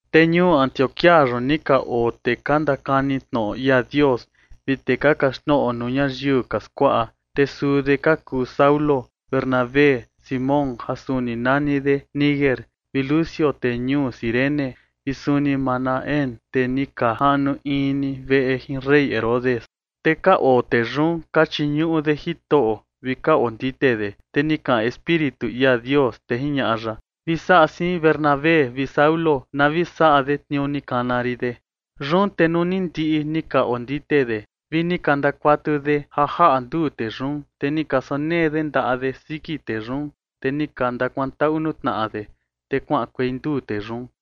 Te ñuu Antioquía yun ni ka oo tee ka ndakani tnoꞌo ia Dios vi tee ka kaxtnoꞌo nuu ñayiu ka skuaꞌa. Te suu de ka kuu Saulo, Bernabé, Simón ja suni nani de Niger, vi Lucio tee ñuu Cirene, vi suni Manaén tee ni ka jaꞌnu in ni veꞌe jin rey Herodes. Te ka oo tee yun ka chiñuꞌu de Jitoꞌo vi ka ondite de, te ni kaꞌan Espíritu ia Dios, te jiñaꞌa ya: ―Vi saꞌa siin Bernabé vi Saulo na vi saꞌa de tniuu ni kana rin de. Yun te nuu ni ndiꞌi ni ka ondite de vi ni ka ndakuatu de ja jaꞌa nduu tee yun, te ni ka sonee de ndaꞌa de siki tee yun, te ni ka ndakuantaꞌu nuu tnaꞌa de, te kuaꞌankuei nduu tee yun.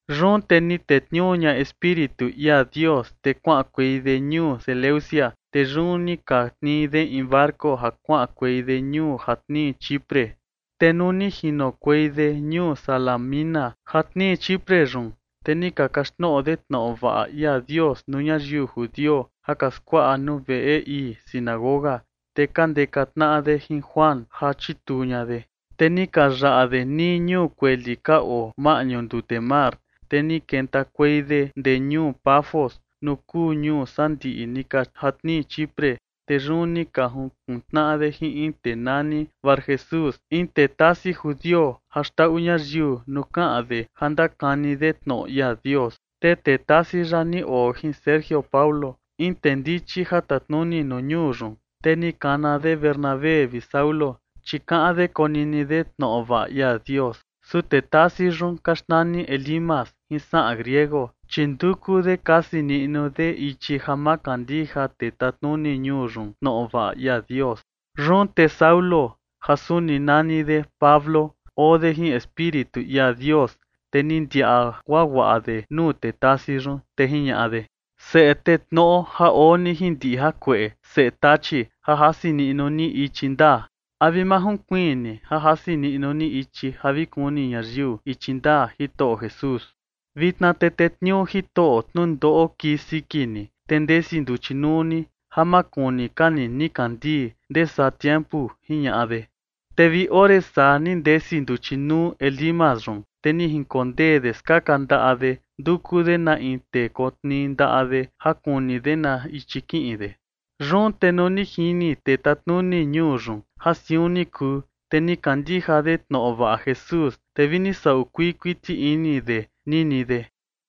Yun te ni tetniuu ña Espíritu ia Dios, te kuaꞌankuei de ñuu Seleucia. Te yun ni ka tnii de in barco ja kuaꞌankuei de ñuu ja tnii Chipre. Te nuu ni jinokuei de ñuu Salamina ja tnii Chipre yun, te ni ka kaxtnoꞌo de tnoꞌo vaꞌa ia Dios nuu ñayiu judio ja ka skuaꞌa nuu veꞌe ii sinagoga. Te ka ndeka tnaꞌa de jin Juan ja chituu ña de. Te ni ka yaꞌa de nii ñuu kueli ka oo maꞌñu ndute mar, te ni kentakuei de ndee ñuu Pafos nuu kuu ñuu sandiꞌi ni ka ja tnii Chipre. Te yun ni ka jukun tnaꞌa de jin in tee nani Barjesús, in tee tasi judio ja xndaꞌu ñayiu nuu kaꞌan de ja ndakani de tnoꞌo ia Dios. Te tee tasi yaꞌa ni oo jin Sergio Paulo, in tee ndichi ja tatnuni nuu ñuu yun. Te ni kana de Bernabé vi Saulo, chi kaꞌan de konini de tnoꞌo vaꞌa ia Dios. Su tee tasi yun ka xnani Elimas jin saꞌan griego, chi nduku de kasi niꞌnu de ichi ja ma kandija tee tatnuni ñuu yun tnoꞌo vaꞌa ia Dios. Yun te Saulo, ja suni nani de Pablo, oo de jin Espíritu ia Dios, te ni ndiaꞌa guaguaꞌa de nuu tee tasi yun. Te jiñaꞌa de: ―Seꞌe tee tnoꞌo ja oo ni jin ndiꞌi jakueꞌe, seꞌe tachi ja jasi niꞌnu ni ichi ndaa, ¿a vi ma junkuiin ni ja jasi niꞌnu ni ichi ja vi kuni ñayiu ichi ndaa Jitoꞌo Jesús? Vitna te tetniuu Jitoꞌo tnundoꞌo kii siki ni, te ndesi nduchi nuu ni, ja ma kuni ka ni nikandii ndee saa tiempu ―jiñaꞌa de. Te vi ore saa ni ndesi nduchi nuu Elimas yun, te ni jinkondee de skaka ndaꞌa de, nduku de na in tee kotnii ndaꞌa de ja kuni de na ichi kiꞌin de. Yun te nuu ni jini tee tatnuni ñuu yun ja siun ni kuu, te ni kandija de tnoꞌo vaꞌa Jesús, te vi ni saꞌu kuii kuiti ini de nini de.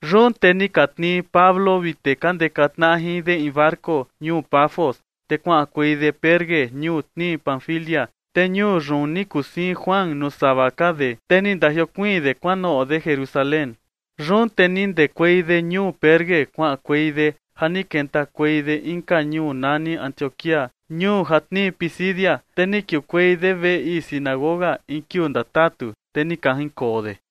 Yun te ni ka tnii Pablo vi tee ka ndeka tnaꞌa jin de in barco ñuu Pafos, te kuaꞌankuei de Perge, ñuu tnii Panfilia. Te ñuu yun ni kuu siin Juan nuu sava ka de, te ni ndajiokuiin de kuanoꞌo de Jerusalén. Yun te ni ndekuei de ñuu Perge kuaꞌankuei de, ja ni kentakuei de inka ñuu nani Antioquía, ñuu ja tnii Pisidia, te ni kiukuei de veꞌe ii sinagoga in kiuu ndatatu, te ni ka jinkoo de.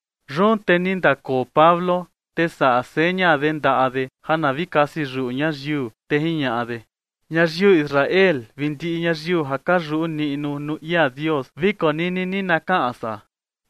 Yun te ni ndakoo Pablo, te saꞌa seña de ndaꞌa de ja na vi kasi yuꞌu ñayiu, te jiñaꞌa de: ―Ñayiu Israel vi ndiꞌi ñayiu ja ka yuꞌu niꞌnu nuu ia Dios, vi konini ni na kaꞌan san.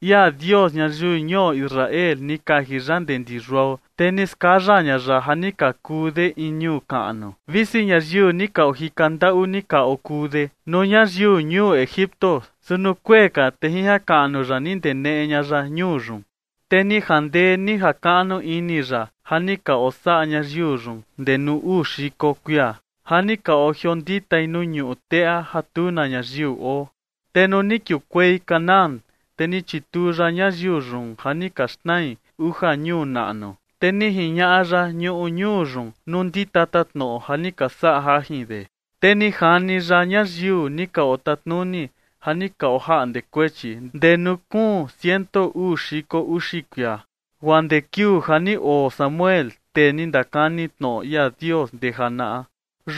Ia Dios ñayiu ñuo Israel ni kaji ya ndee ndi yuao, te ni skaya ña ya ja ni ka kuu de in ñuu kaꞌnu, visi ñayiu ni ka ojika ndaꞌu ni ka okuu de nuu ñayiu ñuu Egipto. Su nuu kuee ka, te jin jakaꞌnu ya ni ndeneꞌe ña ya ñuu yun. Te ni jandee ni jakaꞌnu ini ya ja ni ka osaꞌa ñayiu yun ndee nuu uu xiko kuia ja ni ka ojionditai nuu ñuꞌu teꞌa ja tu na ñayiu oo. Te nuu ni kiukuei Canaán, te ni chituu ya ñayiu yun ja ni ka xnai uja ñuu naꞌnu, te ni jiñaꞌa ya ñuꞌu ñuu yun nuu ndi tatatnoꞌo ja ni ka saꞌa jajin de. Te ni jani ya ñayiu ni ka otatnuni ja ni ka ojaꞌnde kuechi ndee nuu kuun ciento uu xiko uxi kuia, guaa ndee kiuu ja ni oo Samuel, tee ni ndakani tnoꞌo ia Dios ndee janaꞌa.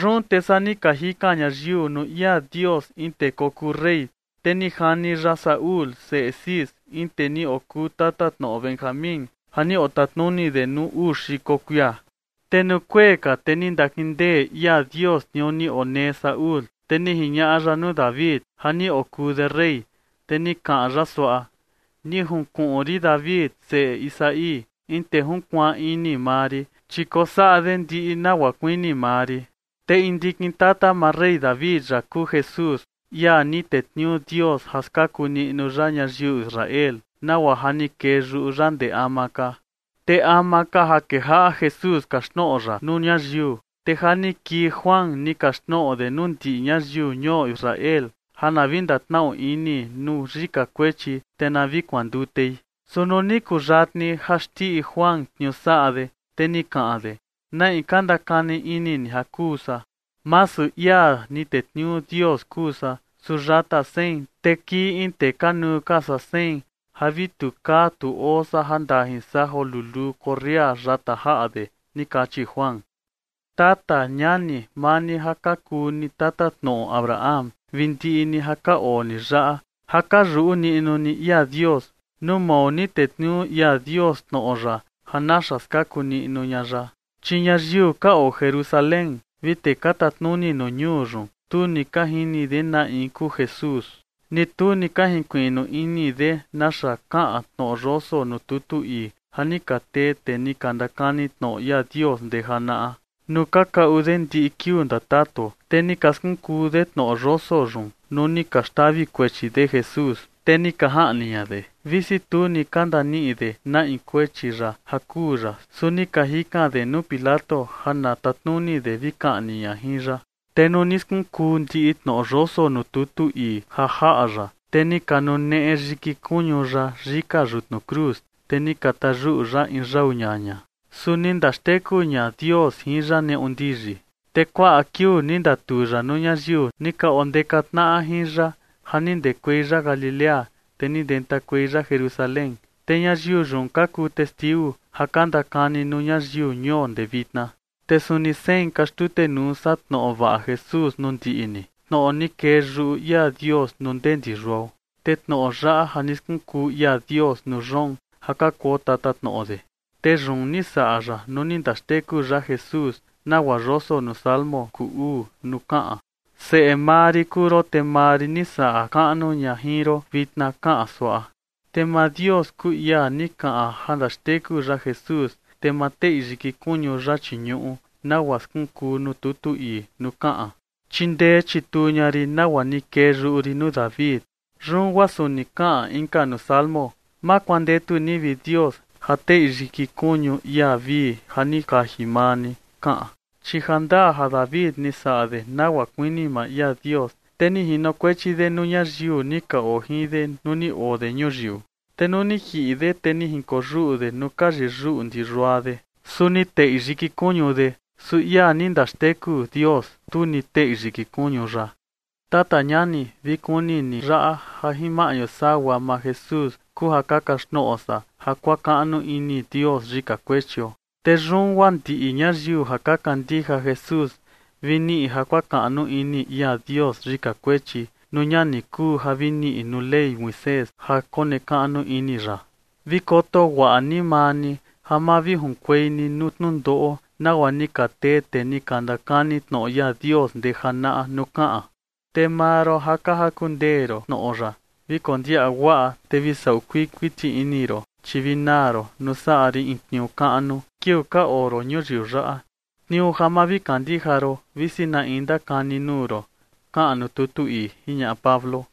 ’Yun te saa ni ka jikan ñayiu nuu ia Dios in tee kokuu rey. Te ni jani ya Saúl, seꞌe Cis, in tee ni okuu tatatnoꞌo Benjamín ja ni otatnuni de nuu uu xiko kuia. Te nuu kuee ka, te ni ndakindee ia Dios tniuu ni onee Saúl, te ni jiñaꞌa ya nuu David ja ni okuu de rey, te ni kaꞌan ya suaꞌa: “Ni junkuꞌun rin David, seꞌe Isaí, in tee junkuaan ini maa rin, chi kosaꞌa de ndiꞌi nagua kuini maa rin”. Te in ndikin tata maa rey David yaꞌa kuu Jesús, ia ni tetniuu Dios ja skaku niꞌnu ya ñayiu Israel, nagua ja ni kee yuꞌu ya ndee ama ka. Te ama ka ja kejaꞌa Jesús kaxtnoꞌo ya nuu ñayiu, te ja ni kii Juan, ni kaxtnoꞌo de nuu ndiꞌi ñayiu ñuo Israel ja na vi ndatnaꞌu ini nuu yika kuechi, te na vi kuandutei. Su nuu ni kuyatni ja xndiꞌi Juan tniuu saꞌa de, te ni kaꞌan de: “¿Na in ka ndakani ini ni ja kuu san? Masu ia ni tetniuu Dios kuu san, su yata sein, te kii in tee kanuu ka saa sein ja vi tu kaa tu oo san ja ndajin san joo luluu korria yata jaꞌa de” ni kachi Juan. ’Tata ñani, maa ni ja ka kuu ni tatatnoꞌo Abraham, vi ndiꞌi ni ja ka oo ni yaꞌa ja ka yuꞌu niꞌnu ni ia Dios, nuu mao ni tetniuu ia Dios tnoꞌo ya ja naxa skaku niꞌnu ña ya. Chi ñayiu ka oo Jerusalén vi tee ka tatnuni nuu ñuu yun, tu ni ka jini de na in kuu Jesús, ni tu ni ka jinkuiꞌnu ini de naxa kaꞌan tnoꞌo yoso nuu tutu ii ja ni ka tee tee ni ka ndakani tnoꞌo ia Dios ndee janaꞌa, nuu ka kaꞌu de ndiꞌi kiuu ndatatu. Te ni ka skunkuu de tnoꞌo yoso yun nuu ni ka xtavi kuechi de Jesús, te ni ka jaꞌni ña de. Visi tu ni ka ndaniꞌi de na in kuechi ya ja kuu ya, su ni ka jikan de nuu Pilato ja na tatnuni de vi kaꞌni ña jin ya. Te nuu ni skunkuu ndiꞌi tnoꞌo yoso nuu tutu ii ja jaꞌa ya, te ni ka nuneꞌe yiki kuñu ya yika yutnu cruz, te ni ka tayuꞌu ya in yau ñaña. Su ni ndaxteku ña Dios jin ya neꞌu ndiyi. Te kuaꞌa kiuu ni ndatuu ya nuu ñayiu, ni ka ondeka tnaꞌa jin ya ja ni ndekuei ya Galilea, te ni ndentakuei ya Jerusalén, te ñayiu yun ka kuu testiu ja ka ndakani nuu ñayiu ñuo ndee vitna. ’Te suni sein ka xtutenuu san tnoꞌo vaꞌa Jesús nuu ndiꞌi ni, tnoꞌo ni kee yuꞌu ia Dios nuu ndee ndi yuao. Te tnoꞌo yaꞌa ja ni skunkuu ia Dios nuu yoon ja ka kuo tatatnoꞌo de. Te yun ni saꞌa ya nuu ni ndaxteku ya Jesús, nagua yoso nuu Salmo kuu uu nuu kaꞌan: Seꞌe maa rin kuu ron, te maa rin ni saꞌa kaꞌnu ña jin ron vitna, kaꞌan suaꞌa. ’Te maa Dios, kuu ia ni kaꞌan ja ndaxteku ya Jesús, te ma teꞌi yiki kuñu ya chii ñuꞌu, nagua skunkuu nuu tutu ii nuu kaꞌan: Chindee chituu ña rin nagua ni kee yuꞌu rin nuu David. ’Yun guaa suni kaꞌan inka nuu Salmo: Ma kuandetu ni, vi Dios, ja teꞌi yiki kuñu ia vii ja ni kaji maa ni, kaꞌan. ’Chi ja ndaa ja David ni saꞌa de nagua kuini maa ia Dios, te ni jinokuechi de nuu ñayiu ni ka oo jin de nuu ni oo de ñuyiu. Te nuu ni jiꞌi de, te ni jinkoyuꞌu de nuu ka yiyuꞌu ndi yua de, su ni teꞌi yiki kuñu de. Su ia ni ndaxteku Dios, tu ni teꞌi yiki kuñu ya. Tata ñani, vi kuni ni yaꞌa, ja jin maꞌñu sagua maa Jesús kuu ja ka kaxtnoꞌo san ja kuakaꞌnu ini Dios yika kuechio. Te yun guaa ndiꞌi ñayiu ja ka kandija Jesús vi niꞌi ja kuakaꞌnu ini ia Dios yika kuechi, nuu ña ni kuu ja vi niꞌi nuu Ley Moisés ja konekaꞌnu ini ya. Vi koto guaꞌa ni maa ni ja ma vi junkuei ni nuu tnundoꞌo, nagua ni ka tee tee ni ka ndakani tnoꞌo ia Dios ndee janaꞌa nuu kaꞌan: Te maa ron ja ka jaku ndee ron tnoꞌo yaꞌa, vi kondiaꞌa guaꞌa, te vi saꞌu kuii kuiti ini ron, chi vi naa ron nuu saꞌa rin in tniuu kaꞌnu kiuu ka oo ron ñuyiu yaꞌa, tniuu ja ma vi kandija ron, visi na in ndakani nuu ron, kaꞌan nuu tutu ii ―jiñaꞌa Pablo.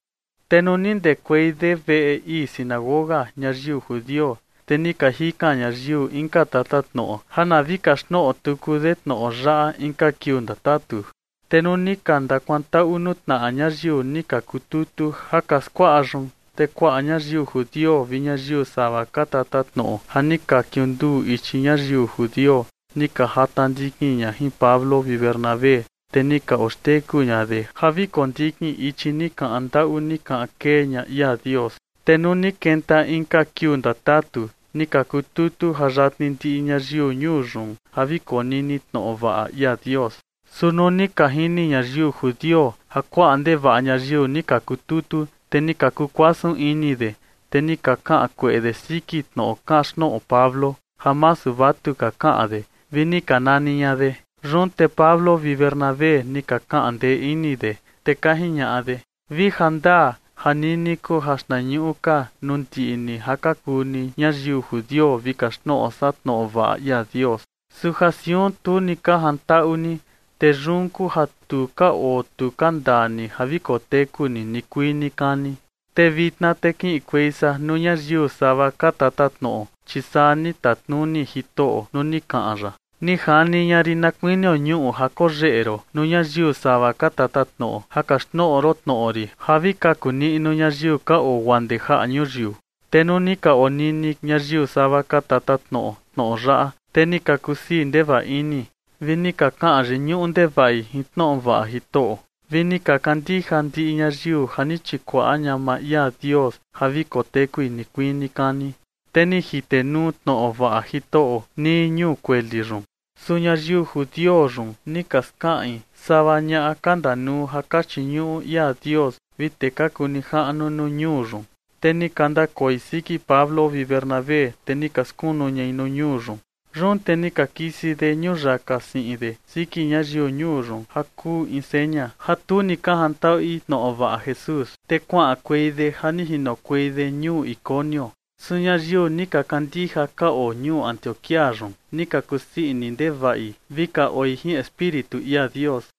Te nuu ni ndekuei de veꞌe ii sinagoga ñayiu judio, te ni ka jikan ñayiu inka tatatnoꞌo ja na vi kaxtnoꞌo tuku de tnoꞌo yaꞌa inka kiuu ndatatu. Te nuu ni ka ndakuantaꞌu nuu tnaꞌa ñayiu ni ka kututu ja ka skuaꞌa yun, te kuaꞌa ñayiu judio vi ñayiu sava ka tatatnoꞌo ja ni ka kiunduu ichi ñayiu judio, ni ka jata ndikin ña jin Pablo vi Bernabé, te ni ka oxteku ña de ja vi kondikin ichi ni kaꞌan ndaꞌu ni kaꞌan kee ña ia Dios. Te nuu ni kenta inka kiuu ndatatu, ni ka kututu ja yatni ndiꞌi ñayiu ñuu yun ja vi konini tnoꞌo vaꞌa ia Dios. Su nuu ni ka jini ñayiu judio ja kuaꞌa ndevaꞌa ñayiu ni ka kututu, te ni ka kukuasun ini de, te ni ka kaꞌan kueꞌe de siki tnoꞌo kaxtnoꞌo Pablo, ja masu vatuka kaꞌan de, vi ni ka nani ña de. Yun te Pablo vi Bernabé ni ka kaꞌan ndee ini de, te ka jiñaꞌa de: ―Vi jandaa ja nini kuu ja xtnañuꞌu ka nuu ndiꞌi ni ja ka kuu ni ñayiu judio vi kaxtnoꞌo san tnoꞌo vaꞌa ia Dios. Su ja siun tu ni ka jantaꞌu ni, te yun kuu ja tu ka oo tu ka ndaa ni ja vi koteku ni nikuii nikani. Te vitna te kiꞌinkuei san nuu ñayiu sava ka tatatnoꞌo. Chi saa ni tatnuni Jitoꞌo nuu ni kaꞌan ya: Ni jani ña rin na kuinio ñuꞌu ja koyeꞌe ron nuu ñayiu sava ka tatatnoꞌo, ja kaxtnoꞌo ron tnoꞌo rin ja vi kaku niꞌnu ñayiu ka oo guaa ndee jaꞌa ñuyiu. Te nuu ni ka onini ñayiu sava ka tatatnoꞌo tnoꞌo yaꞌa, te ni ka kusii ndevaꞌa ini, vi ni ka kaꞌan yiñuꞌu ndevaꞌi jin tnoꞌo vaꞌa Jitoꞌo, vi ni ka kandija ndiꞌi ñayiu ja ni chikuaꞌa ña maa ia Dios ja vi kotekui nikuii nikani. Te ni jitenuu tnoꞌo vaꞌa Jitoꞌo nii ñuu kueli yun. Su ñayiu judio yun ni ka skaꞌin sava ñaꞌa ka ndanuu ja ka chiñuꞌu ia Dios vi tee ka kuu nijaꞌnu nuu ñuu yun, te ni ka ndakoi siki Pablo vi Bernabé, te ni ka skunu ñai nuu ñuu yun. Yun te ni ka kisi de ñuyaka siꞌin de siki ñayiu ñuu yun, ja kuu in seña ja tu ni ka jantaꞌui tnoꞌo vaꞌa Jesús, te kuaꞌankuei de ja ni jinokuei de ñuu Iconio. Su ñayiu ni ka kandija ka oo ñuu Antioquía yun, ni ka kusii ini ndevaꞌi vi ka oi jin Espíritu ia Dios.